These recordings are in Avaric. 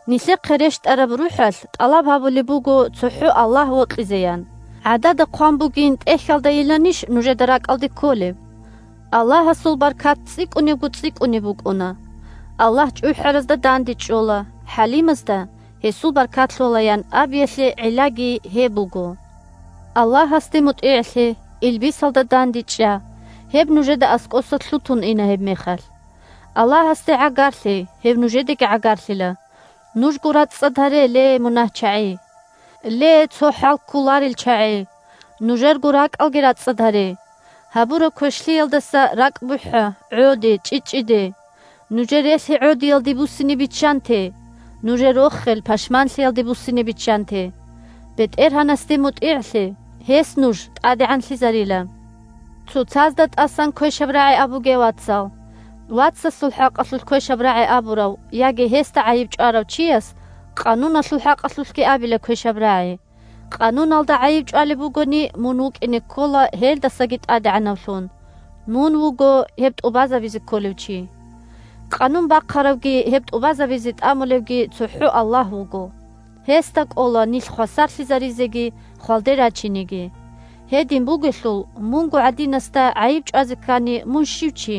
«Нилъехъе рещтӀараб РухӀалъ тӀалаб гьабулеб буго цохӀо Аллагь вокьизе», – ян гӀадада хъван бугин ТӀехьалдайиланищ нужеда ракӀалде кколеб? Аллагьасул баркат цӀикӀкӀунебго-цӀикӀкӀунеб букӀуна. «Аллагь чӀухӀаразда дандечӀола, хӀалимазда гьесул баркат лъола», – ян абиялъе гӀиллаги гьеб буго. Аллагьасде мутӀигӀлъе, илбисалда дандечӀа, гьеб нужеда аскӀоса лъутун ина гьебмехалъ. Аллагьасде гӀагарлъе, гьев нужедеги гӀагарлъила. Нужго рацӀцӀад гьаре, ле мунагьчагӀи! Ле цо хӀал кколарел чагӀи, нужерго ракӀалги рацӀцӀад гьаре! Гьабураб квешлъиялдаса ракӀ бухӀа, гӀоде, чӀчӀичӀчӀиде! Нужер релъи гӀодиялде буссине биччанте, нужер рохел пашманлъиялде буссине биччанте! БетӀергьанасде мутӀигӀлъе, гьес нуж тӀадегӀанлъизарила. Цоцазда тӀасан квешаб рагӀи абуге, вацал. Вацасул хӀакъалъулъ квешаб рагӀи абурав яги гьесда гӀайиб чӀварав чияс Къануналъул хӀакъалъулъги абила квешаб рагӀи, Къануналда гӀайиб чӀвалеб бугони, мун вукӀине ккола гьелдасаги тӀадегӀанавлъун, – мун вуго гьеб тӀубазабизе кколев чи. Къанун бахъаравги гьеб тӀубазабизе тӀамулевги цохӀо Аллагь вуго. Гьесда кӀола нилъ хвасарлъизаризеги хвалде рачинеги. Гьедин бугелъул, мунго гӀадинасда гӀайиб чӀвазе ккани, мун щив чи?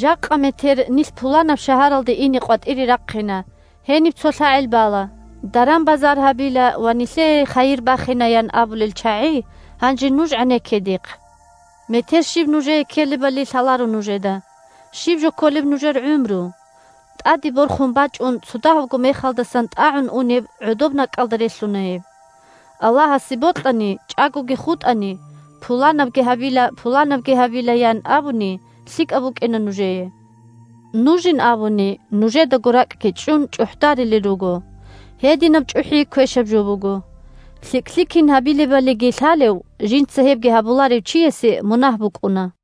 «Жакъа-метер нилъ пуланаб шагьаралде ине къватӀире рахъина, гьениб цо лъагӀел бала, даран-базар гьабила ва нилъее хайир бахина», – ян абулел чагӀи, гьанже нуж гӀенекке дихъ! Метер щиб нужее ккелебали лъаларо нужеда. Щиб жо кколеб нужер гӀумру? ТӀаде борхун бачӀун цо дагьабго мехалдасан тӀагӀун унеб гӀодобнакӀкӀалда релълъуна гьеб. «Аллагьасе бокьани, чӀагоги хутӀани, пуланабги гьабила, пуланабги гьабила», – ян абуни лъикӀаб букӀина нужее. Нужин абуни, нужедаго ракӀги чӀун, чӀухӀдарилел руго. Гьединаб чӀухӀи квешаб жо буго. ЛъикӀлъи кин гьабилебалиги лъалев, жинца гьебги гьабуларев чиясе мунагь букӀуна.